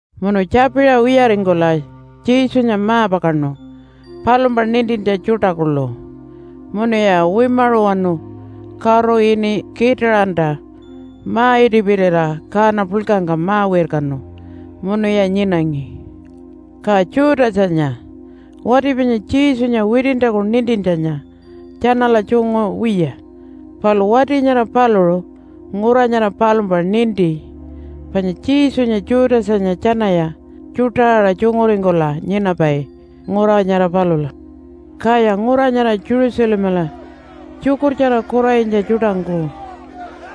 Munu tjapiṟa wiyaringkula Jesunya ma-pakaṉu palumpa nintintja tjuṯa kuḻu. Munuya wimaṟuwanu karu ini Kitaṟanta ma-itipirira kaana puḻkangka ma-wirkanu munuya nyinangi. Ka Judasanya, wati panya Jesunya witintjaku nintintjanya tjanala tjungu wiya. Palu wati nyara paluṟu ngura nyara palumpa ninti panya Jesunya Judasanya tjanaya tjuṯa aṟa tjunguringkula nyinapai ngura nyara palula. Kaya ngura nyara Jerusalemala tjukurtjara kuranyitja tjuṯangku,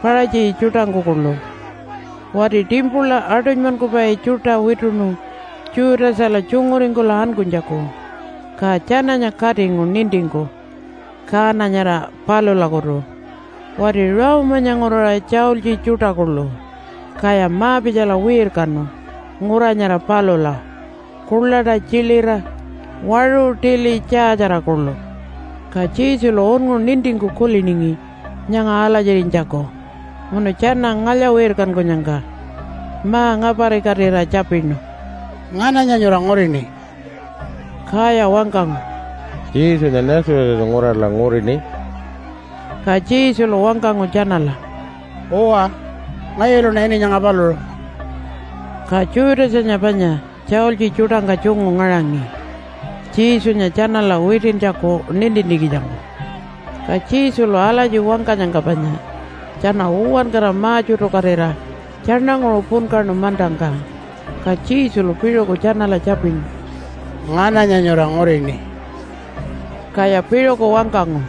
Paṟatji tjuṯangku kuḻu wati timpula aṯunymankupai tjuṯa wituṉu Judasala tjunguringkula ankunytjaku, ka tjananya katingu nintingku kaana nyara palulakutu wati Rome-anya nguraṟa tjaultji tjuṯa kuḻu. Kaya ma-pitjala wirkanu ngura nyara palula kuḻaṯa tjilira, waṟu tili tjaatjara kuḻu. Ka Jesulu unngu nintingku kuliningi nyanga alatjirinytjaku, munu tjana ngalya-wirkankunyangka ma-ngaparikatira tjapinu, “Ngananya nyura ngurini?” Kaya wangkangu, “Jesunya Nazarethanya nguraṟala ngurini.” Ka Jesulu wangkangu tjanala, “Uwa, ngayuluṉa ini nyanga paluṟu.” Ka Judasanya panya tjaultji tjuṯangka tjungu ngaṟangi Jesunya tjanala witintjaku nintintjikitjangku. Ka Jesulu alatji wangkanyangka panya tjana uwankara ma-tjutukatira tjaṉanguṟu punkaṉu mantangka. Ka Jesulu piṟuku tjanala tjapinu, “Ngananya nyura ngurini?” Kaya piṟuku wangkangu,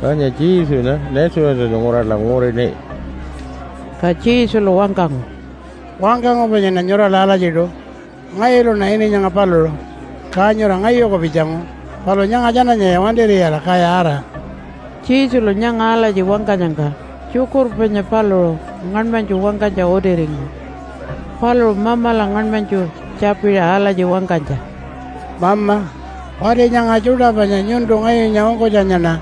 “Panya Jesunya Nazarethanya nguraṟala ngurini.” Ka Jesulu wangkangu, “Wangkangu panyaṉa nyurala alatjiṯu. Ngayuluṉa ini nyanga paluṟu. Ka nyura ngayuku pitjangu, palu nyanga tjananyaya wantir'iyala kaya ara.” (Jesulu nyanga alatji wangkanyangka tjukurpa panya paluṟu ngaṉmanytju wangkanytja utiringu, paluṟu Mamala ngaṉmanytju tjapiṟa alatji wangkanytja, “Mama, wati nyanga tjuṯa panya nyuntu ngayunya ungkunytjaṉa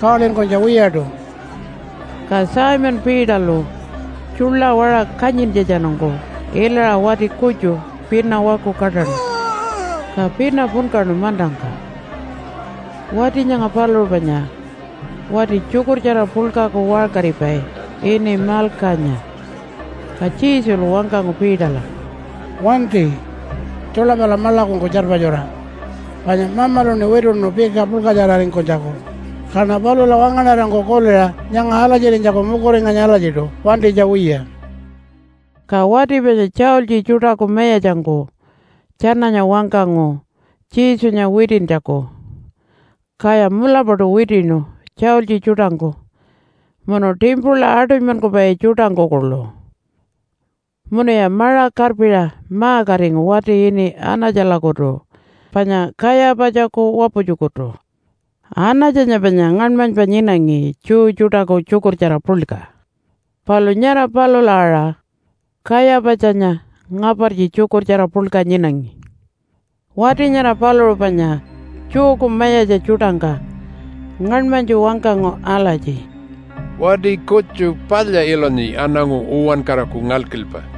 kawalinkunytja wiyaṯu.”) Ka Simon Peterlu tjuḻa waṟa kanyintjatjanungku ilaṟa wati kutju pina waku kaṯaṉu, ka pina punkaṉu mantangka. Wati nyanga paluṟu panya wati tjukurtjara puḻkaku waṟkaripai ini Malkanya. Ka Jesulu wangkangu Peterla, “Wanti! Tjuḻa pala maḻakungku tjarpatjura. Panya Mamaluṉi wituṉu pika puḻkatjararingkunytjaku, kaṉa palula wangaṉarangku kuliṟa nyanga alatjirinytjaku mukuringanyi alatjiṯu wantinytja wiya.” Ka wati panya tjaultji tjuṯaku mayatjangku tjananya wangkangu Jesunya witintjaku, kaya mulapaṯu witiṉu tjaultji tjuṯangku munu timpula aṯunymankupai tjuṯangku kuḻu. Munuya maṟa karpiṟa ma-katingu wati ini Anatjalakutu panya Kayapatjaku waputjukutu. Anatjanya panya ngaṉmanypa nyinangi Jew tjuṯaku Tjukurtjara Puḻka, palu nyara palula aṟa Kayapatjanya ngapartji Tjukurtjara Puḻka nyinangi. Wati nyara paluṟu panya Jewku mayatja tjuṯangka ngaṉmanytju wangkangu alatji, “Wati kutju palya ilunyi aṉangu uwankaraku ngalkilpa.”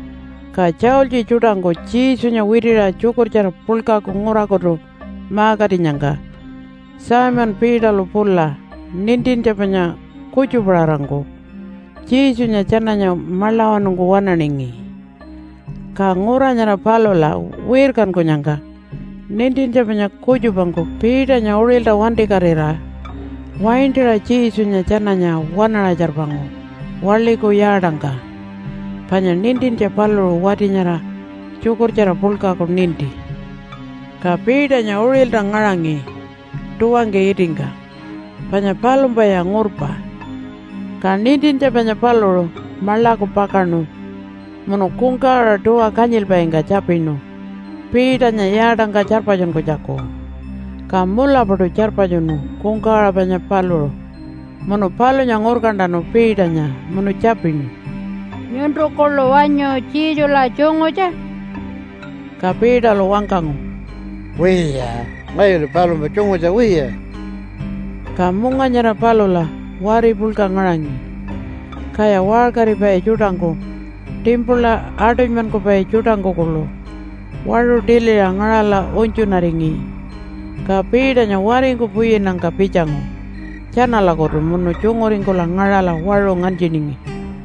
Ka tjaultji tjuṯangku Jesunya witiṟa Tjukurtjara Puḻkaku ngurakutu ma-katinyangka Simon Peterlu pula nintintja panya kutjupaṟarangku Jesunya tjananya maḻawanungku waṉaningi. Ka ngura nyara palula wirkankunyangka nintintja panya kutjupangku Peternya uṟilta wantikatira waintaṟa Jesunya tjananya waṉaṟa tjarpangu waḻiku yaatangka. Panya nintintja paluṟu wati nyara Tjukurtjara Puḻkaku ninti. Ka Peternya uṟilta ngaṟangi tuwangka itingka panya palumpaya ngurpa. Ka nintintja panya paluṟu maḻaku pakaṉu munu kungkawaṟa tuwa kanyilpaingka tjapinu Peternya yaatangka tjarpatjunkunytjaku, ka mulapaṯu tjarpatjunu kungkawaṟa panya paluṟu. Munu palunya ngurkantanu Peternya munu tjapinu, “Nyuntu kuḻu wanyu Jesula tjungutja?” Ka Peterlu wangkangu, “Wiya! Ngayulu palumpa tjungutja wiya.” Ka munga nyara palula wari puḻka ngaṟangi, kaya waṟkaripai tjuṯangku timpula aṯunymankupai tjuṯangku kuḻu waṟu tiliṟa ngaṟala unytjunaringi. Ka Peternya waringku puyinnyangka pitjangu tjanalakutu munu tjunguringkula ngaṟala waṟu nganytjiningi.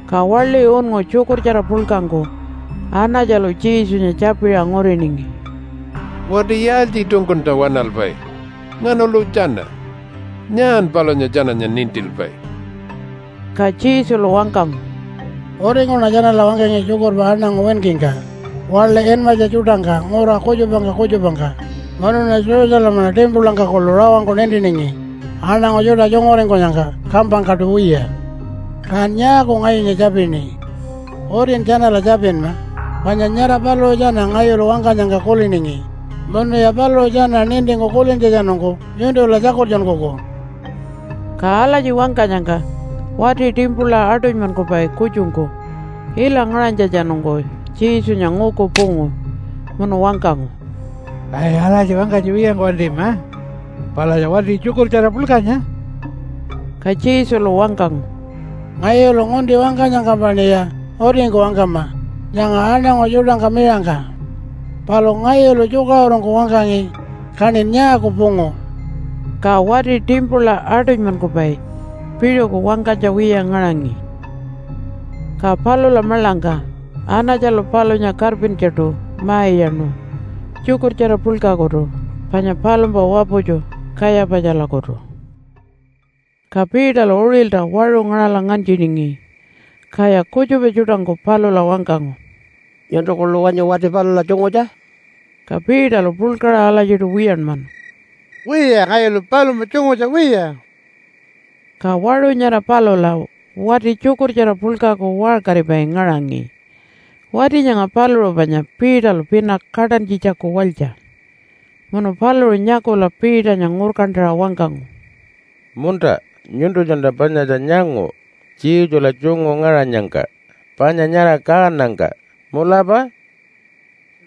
Ka waḻi unngu Tjukurtjara Puḻkangku Anatjalu Jesunya tjapiṟa nguriningi, “Wati yaaltjiṯungkunta waṉalpai? Nganalu tjana? Nyaan palunya tjananya nintilpai?” Ka Jesulu wangkangu, “Utingkuṉa tjanala wangkangi tjukurpa aṉangu winkingka, waḻi inmatja tjuṯangka ngura kutjupangka kutjupangka munuṉa Jerusalemala timpulangka kuḻu rawangku nintiningi aṉangu tjuṯa tjunguringkunyangka kampangkaṯu wiya. Kan nyaaku ngayunya tjapini? Utin tjanala tjapinma panya nyara paluṟu tjana ngayulu wangkanyangka kuliningi, munuya paluṟu tjana nintingku kulintjatjanungku nyuntula tjakultjunkuku.” Ka alatji wangkanyangka wati timpula aṯunymankupai kutjungku ila ngaṟanytjatjanungku Jesunya nguku pungu, munu wangkangu, “Ai, alatji wangkanytja wiyangku wantima! Palatja wati Tjukurtjara Puḻkanya.” Ka Jesulu wangkangu, “Ngayulu ngunti wangkanyangkampaṉiya utingku wangkama nyanga aṉangu tjuṯangka miṟangka. Palu ngayulu tjukaṟurungku wangkangi, kaṉin nyaaku pungu?” Ka wati timpula aṯunymankupai piṟuku wangkanytja wiya ngaṟangi. Ka palula maḻangka Anatjalu palunya karpintjaṯu ma-iyaṉu Tjukurtjara Puḻkakutu panya palumpa waputju Kayapatjalakutu. Ka Peterlu uṟilta waṟu ngaṟala nganytjiningi. Kaya kutjupa tjuṯangku palula wangkangu, “Nyuntu kuḻu wanyu wati palula tjungutja?” Ka Peterlu puḻkaṟa alatjiṯu wiyanmanu, “Wiya! Ngayulu palumpa tjungutja wiya.” Ka waṟu nyara palula wati Tjukurtjara Puḻkaku waṟkaripai ngaṟangi. Wati nyanga paluṟu panya Peterlu pina kaṯantjitjaku walytja. Munu paluṟu nyakula Peternya ngurkantaṟa wangkangu, “Munta, nyuntunyaṉa panyatja nyangu, Jesula tjungu ngaṟanyangka, panya nyara kaanangka. Mulapa?”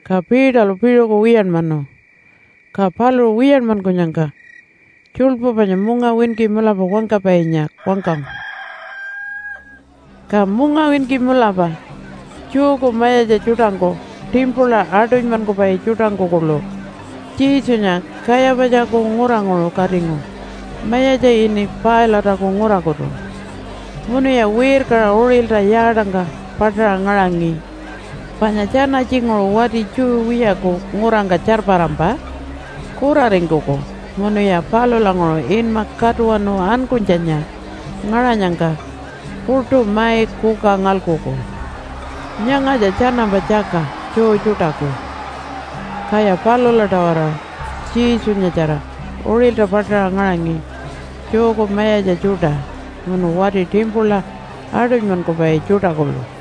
Ka Peterlu piṟuku wiyanmanu. Ka paluṟu wiyanmankunyangka tjuḻpu panya mungawinki mulapa wangkapainya wangkangu. Ka mungawinki mulapa Jewku mayatja tjuṯangku timpula aṯunymankupai tjuṯangku kuḻu Jesunya Kayapatjaku nguranguṟu katingu mayatja ini Pilate-aku ngurakutu. Munuya wirkaṟa uṟilta yaatangka paṯaṟa ngaṟangi, panya tjana tjinguṟu wati Jew wiyaku ngurangka tjarparampa kuraringkuku munuya palulanguṟu inma Katuwanu Ankunytjanya ngaṟanyangka puṯu mai kuka ngalkuku. Nyangatja tjanampa tjaka Jew tjuṯaku, kaya palula-tawara Jesunyatjara uṟilta paṯaṟa ngaṟangi Jewku mayatja tjuṯa munu wati timpula aṯunymankupai tjuṯa kuḻu.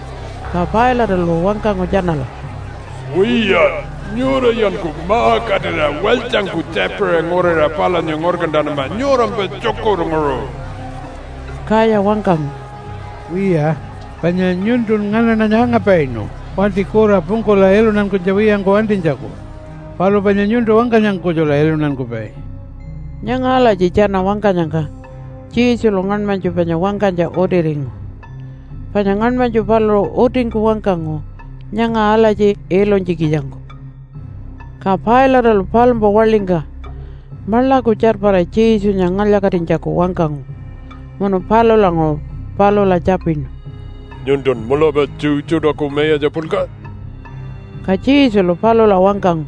Ka Pilate-alu wangkangu tjanala, “Wiya, nyurayanku ma-katira walytjangku tjapiṟa nguriṟa palunya ngurkantanama nyurampa tjukurnguṟu.” Kaya wangkangu, “Wiya, panya nyuntun nganaṉanya angapainu wati kura pungkula iluntankunytja wiyangku wantinytjaku. Palu panya nyuntu wangkanyangka kutjula iluntankupai.” (Nyanga alatji tjana wangkanyangka Jesulu ngaṉmanytju panya wangkanytja utiringu, panya ngaṉmanytju paluṟu utingku wangkangu nyanga alatji ilunytjikitjangku.) Ka Pilate-alu palumpa waḻingka maḻaku tjarpara Jesunya ngalya-katinytjaku wangkangu. Munu palulanguṟu palula tjapinu, “Nyuntun mulapa Jew tjuṯaku mayatja puḻka?” Ka Jesulu palula wangkangu,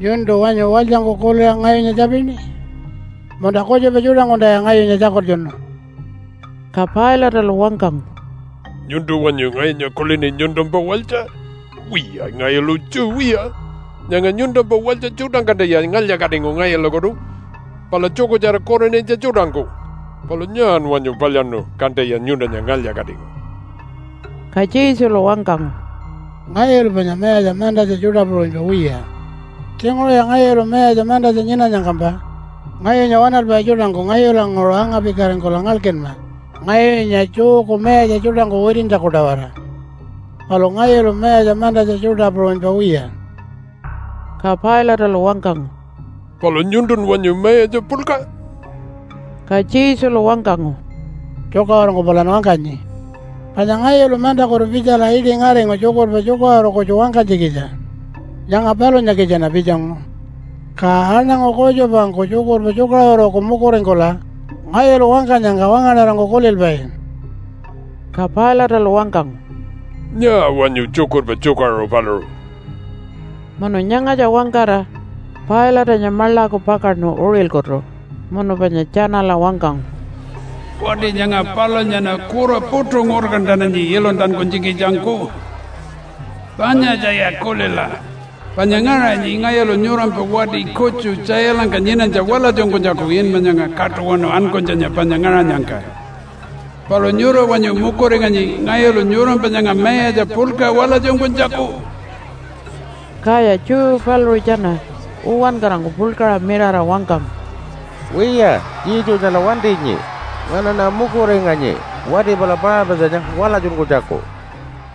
“Nyuntu wanyu walytjangku kuliṟa ngayunya tjapini? Munta kutjupa tjuṯangkunta ngayunya tjakultjunu?” Ka Pilate-alu wangkangu, “Nyuntu wanyu ngayunya kulini nyuntumpa walytja? Wiya, ngayulu Jew wiya. Nyanga nyuntumpa walytja tjuṯangkuntaya ngalya-katingu ngayulakutu pala tjukurtjara kuranyitja tjuṯangku. Palu nyaan wanyu palyaṉu kantaya nyuntunya ngalya-katingu?” Ka Jesulu wangkangu, “Ngayulu panya mayatja mantatja tjuṯa puṟunypa wiya. Tjinguṟuya ngayulu mayatja mantatja nyinanyangkampa ngayunya waṉalpai tjuṯangku ngayulanguṟu anga-pikaringkula ngalkinma ngayunya Jewku mayatja tjuṯangku witintjaku-tawara. Palu ngayulu mayatja mantatja tjuṯa puṟunypa wiya.” Ka Pilate-alu wangkangu, “Palu nyuntun wanyu mayatja puḻka?” Ka Jesulu wangkangu, “Tjukaṟurungku palan wangkanyi. Panya ngayulu mantakutu pitjala iṯi ngaringu tjukurpa tjukaṟuru kutju wangkanytjikitja. Nyanga palunyakitjaṉa pitjangu. Ka aṉangu kutjupangku tjukurpa tjukaṟuruku mukuringkula ngayulu wangkanyangka wangaṉarangku kulilpai.” Ka Pilate-alu wangkangu, “Nyaa wanyu tjukurpa tjukaṟuru paluṟu?” Munu nyangatja wangkara Pilate-anya maḻaku pakaṉu uṟilkutu, munu panya tjanala wangkangu, “Wati nyanga palunyaṉa kura puṯu ngurkantananyi iluntankunytjikitjangku. Panyatjaya kulila panya ngaṟanyi ngayulu nyurampa wati kutju tjailangka nyinanytja walatjunkunytjaku inma nyanga Katuwanu Ankunytjanya panya ngaṟanyangka. Palu nyura wanyu mukuringanyi ngayulu nyurampa nyanga mayatja puḻka walatjunkunytjaku?” Kaya Jew paluṟu tjana uwankarangku puḻkaṟa mirara wangkangu, “Wiya, Jesunyala wantinyi. Nganaṉa mukuringanyi wati pala Paṟapatjanya walatjunkunytjaku.”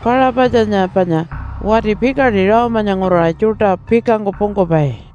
(Paṟapatjanya panya wati pikaṯi Rome-anya nguraṟa tjuṯa pikangku pungkupai.)